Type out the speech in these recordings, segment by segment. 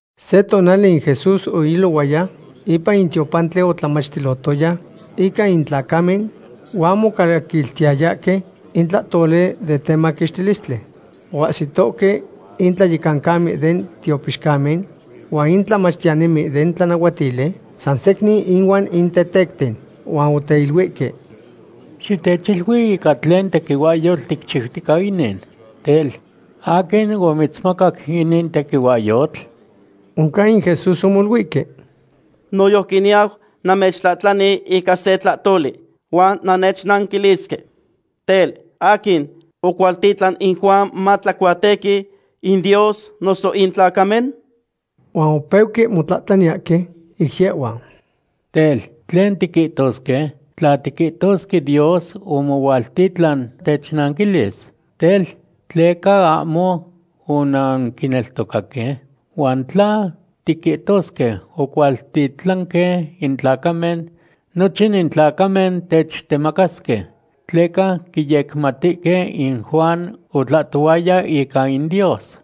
Se tonali in Jesús oilohuaya ipan in tiopantli otlamachtilohtoya ica in tlacamen huan mocaquiltiyahque in tlahtoli den temaquixtilistli. Oahsitohque in tlayecancamen den tiopixcamen huan in tlamachtiyanimen den tlanahuatili san secnin ihuan in tetecten. Huan oteiluihque: ―Xitechilui ica tlen tequihuahyotl ticchiutica inin. Tel, ¿aquin omitzmacac inin tequihuahyotl? Oncan in Jesús omoluihque: ―Noyojqui niyau namechtlahtlani ica se tlahtoli, huan nannechnanquilisque. Tel, ¿aquin ocualtitlan in Juan matlacuatequi; in Dios, noso in tlacamen? Huan opeuque motlahtlaniyahque ic yehhuan: ―Tel, ¿tlen tiquihtosque? Tla tiquihtosque Dios omohualtitlan, technanquilis: “Tel, ¿tleca ahmo onanquineltocaque?” Huan tla tiquihtosque ocualtitlanque in tlacamen, nochin in tlacamen techtemacasque, tleca quiyecmatihque in Juan otlahtohuaya ica in Dios.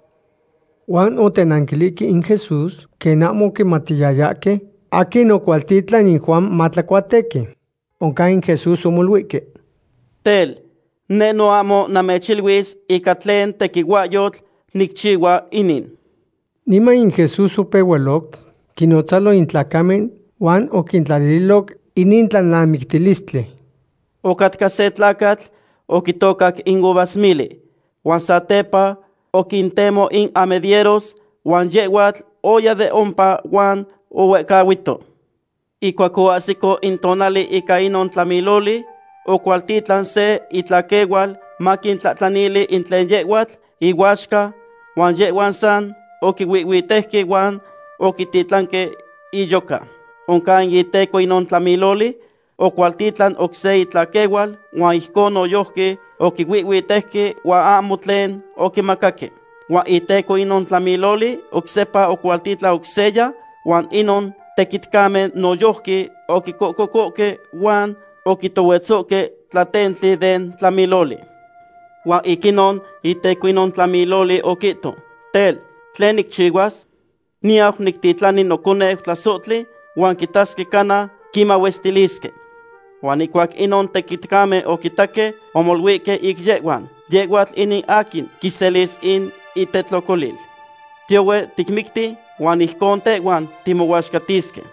Huan otenanquilihque in Jesús quen ahmo oquimatiyayahque aquin oquicualtitlan in Juan matlacuatequi. Oncan in Jesús omoluihque: ―Tel, neh no ahmo namechiluis ica tlen tequihuahyotl nicchihua inin. Niman in Jesús opehualoc quinnotzalo in tlacamen huan oquintlalililoc inin tlalnamictilistli: ―Ocatca se tlacatl oquitocac in uvasmili, huan satepa oquintemo in amedieros huan yehhuatl oya de ompa huan ohuehcahuito. Ihcuac oahsico in tonali ica inon tlamiloli, ocualtitlan se itlaquehual maquintlahtlanili in tlen yehhuatl ihuaxca, huan yehhuan san oquihuihhuitejque huan oquititlanque iyoca. Oncan in iteco inon tlamiloli ocualtitlan oc se itlaquehual, huan ijcon noyojqui oquihuihhuitejque huan ahmo tlen oquimacaque. Huan iteco inon tlamiloli oc sepa ocualtitlan oc seya, huan inon tequitcamen noyojqui oquicocohque huan oquitohuetzohque tlatentli den tlamiloli. ’Huan ic inon iteco inon tlamiloli oquihto: “Tel, ¿tlen nicchihuas? Niyau nictitlani noconeu tlasohtli huan quitasque cana quimahuestilisque.” Huan ihcuac inon tequitcamen oquitaque, omoluihque ic yehhuan: “Yehhuatl inin aquin quiselis in itetlocolil. Tiyohue ticmicti huan ijcon tehhuan timohuaxcatisque.”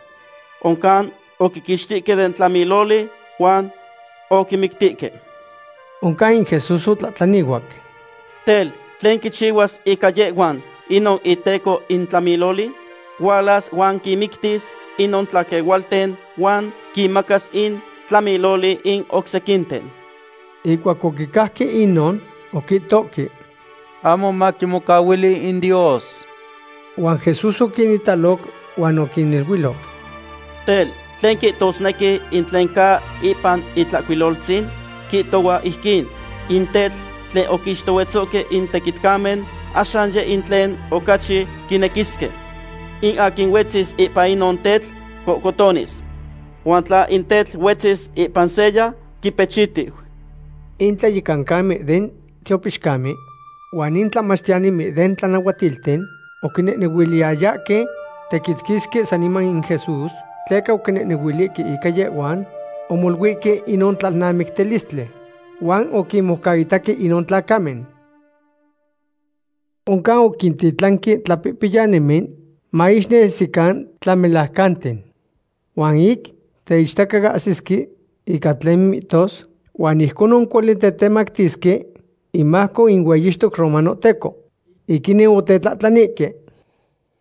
Oncan oquiquixtihque den tlamiloli huan oquimictihque. Oncan in Jesús otlahtlanihuac: ―Tel, ¿tlen quichihuas ica yehhuan inon iteco in tlamiloli? Hualas huan quinmictis inon tlaquehualten huan quimacas in tlamiloli in oc sequinten. Ihcuac oquicajque inon, oquihtohque: ―¡Ahmo maquimocahuili in Dios! Huan Jesús oquinitaloc huan oquiniluiloc: ―Tel, ¿tlen quihtosnequi in tlen ca ipan Itlahcuiloltzin? Quihtohua ijquin: In tetl tlen oquixtohuetzohque in tequitcamen, axan yeh in tlen ocachi quinequisque. In aquin huetzis ipan inon tetl cocohtonis. Huan tla in tetl huetzis ipan seya, quipechitiu. In tlayecancamen den tiopixcamen huan in tlamachtiyanimen den tlanahuatilten oquinequiyayahque tequitzquisque saniman in Jesús, tleca oquinehnehuilihque ica yehhuan omoluihque inon tlalnamictilistli. Huan oquinmoucaitaque inon tlacamen. Oncan oquintitlanque tlapihpiyanimen maixnesican tlamelajcanten. Huan ic teichtacahsisque ica tlen mihtos huan ijconon cuali tetemactisque imajco in hueyixtoc romanohteco. Ic inin otetlahtlanihque: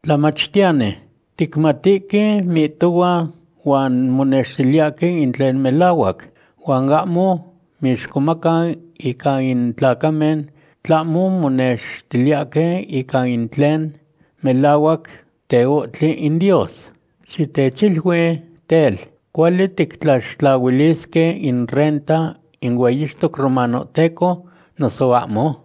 ―Tlamachtiyani, ticmatihque mihtohua huan monextiliyahque in tlen melahuac. Huan ahmo mixcomaca ica in tlacamen, tlahmo monextiliyahque ica in tlen melahuac teohtli in Dios. Xitechilui tel, ¿cuali tictlaxtlahuilisque in renta in hueyixtoc romanohteco, noso ahmo?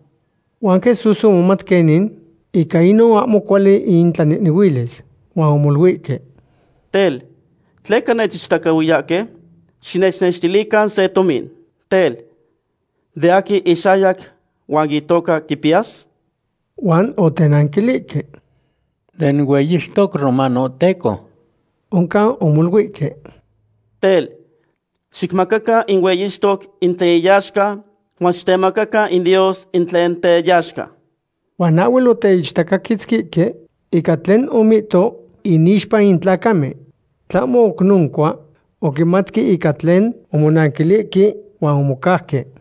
Huan Jesús omomat quenin ica inon ahmo cuali intlanehnehuilis, huan omoluihque: ―Tel, ¿tleca nechichtacahuiyahque? Xinechnextilican se tomin. Tel, ¿de aquin ixayac huan itoca quipiyas? Huan otenanquilihque: ―Den hueyixtoc romanohteco. Oncan omoluihque: ―Tel, xicmacacan in hueyixtoc in tlen iyaxca huan xitemacacan in Dios in tlen teyaxca. Huan ahhuel oteichtacaquitzquihque ica tlen omihto inixpa in tlacamen. Tlahmo oc noncua, oquimatque ica tlen omonanquilihque huan omocauque.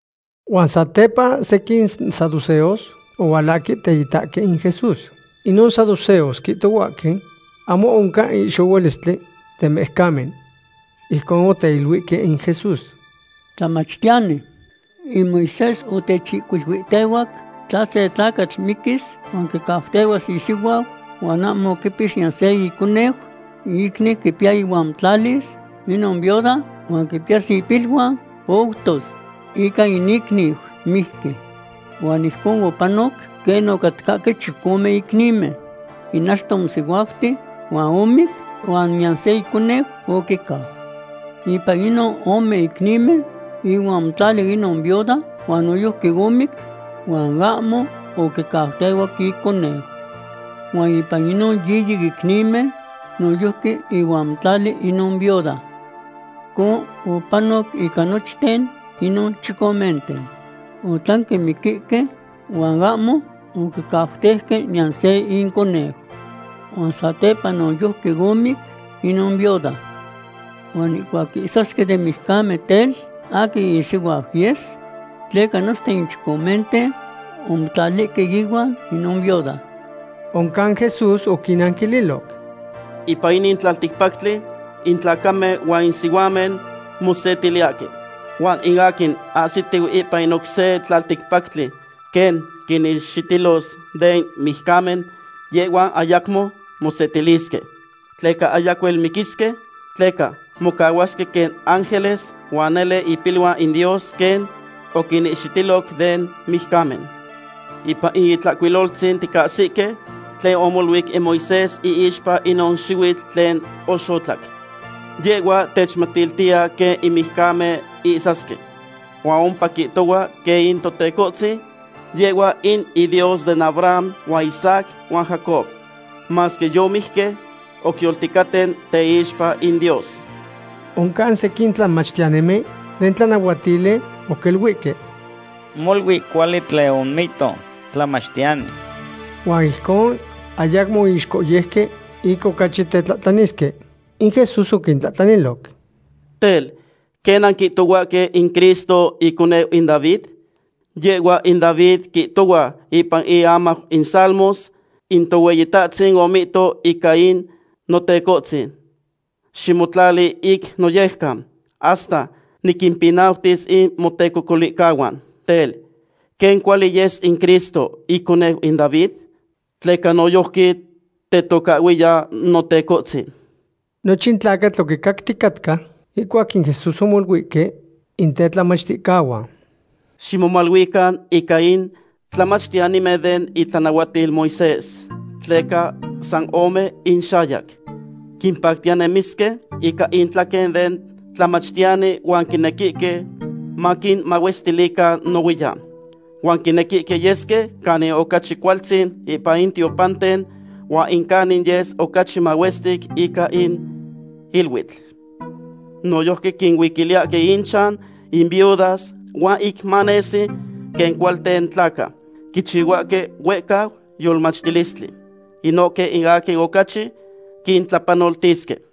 Huan satepa sequin saduceos ohualahque teitaque in Jesús. Inon saduceos quihtohuahque ahmo oncan in ihxohualistli den mijcamen. Ijcon oteiluihque in Jesús: ―Tlamachtiyani, in Moisés otechihcuiluihtehuac tla se tlacatl miquis huan quicautehuas isihuau huan ahmo oquipix niyan se iconeu, in icniu quipiya ihuan motlalis inon viuda huan quipiyas ipiluan poutos ica in icniu mijqui. Huan ijcon opanoc quen ocatcahque chicome icnimen. In achto omosihuauti huan omic, huan niyan se iconeu oquicau. Ipan inon ome icnimen ihuan omotlali inon viuda huan noyojqui omic huan ahmo oquicautehuac iconeu. Huan ipan inon yiyi icnimen noyojqui ihuan omotlali inon viuda. Ijcon opanoc ica nochten inon chicomenten. Otlanque miquihque huan ahmo oquicautejque niyan se inconeu. Huan satepa noyojqui omic inon viuda. Huan ihcuac ihsasque den mijcamen tel, ¿aquin isihuau yes? Tleca nochten in chicomenten omotlalihque ihuan inon viuda. Oncan Jesús oquinnanquililoc: ―Ipan inin tlalticpactli in tlacamen huan in sihuamen mosetiliyahque. Huan in aquin ahsitihue ipan in oc se tlalticpactli quen quinihxitilos den mijcamen, yehhuan ayacmo mosetilisque. Tleca ayacuel miquisque. Tleca mocahuasque quen ángeles, huan nele tepiluan in Dios quen oquinihxitiloc den mijcamen. Ipan in Itlahcuiloltzin ticahsihque tlen omoluic in Moisés iixpa inon xihuitl tlen oxotlac. Yehhua techmatiltiya quen in mijcamen ihsasque. Huan ompa quihtohua quen in Totecohtzin, yehhua in iDios den Abraham huan Isaac huan Jacob. Masque yomijque, oc yolticaten teixpa in Dios. Oncan sequin tlamachtiyanimen den tlanahuatili oquiluihque: ―Molui cuali tlen omihto, tlamachtiyani. Huan ijcon ayacmo oixcohyeuque ic ocachi tetlahtlanisque. In Jesús oquintlahtlaniloc: ―Tel, ¿quen nanquihtohuahque in Cristo iconeu in David? Yehhua in David quihtohua ipan iamau in Salmos: In Tohueyitahtzin omihto ica in Notecohtzin: “Ximotlali ic noyejcan, hasta niquimpinautis in motecocolihcahuan.” Tel, ¿quen cuali yes in Cristo iconeu in David? Tleca noyojqui tetocahhuiya Notecohtzin. Nochin tlacatl oquicacticatca ihcuac in Jesús omoluihque in tetlamachticahuan: ―Ximomaluican ica in tlamachtiyanimen den itlanahuatil Moisés, tleca san ome inxayac. Quimpactiya nemisque ica intlaquen den tlamachtiyani huan quinequihque maquinmahuestilican nohuiyan. Huan quinequihque yesque canin ocachi cualtzin ipan in tiopanten huan in canin yes ocachi mahuestic ica in iluitl. Noyojqui quincuiliyahque inchan in viudas, huan ic manesi quen cualten tlaca, quichihuahque huehcau yolmachtilistli. Inohque in aquin ocachi quintlapanoltisque.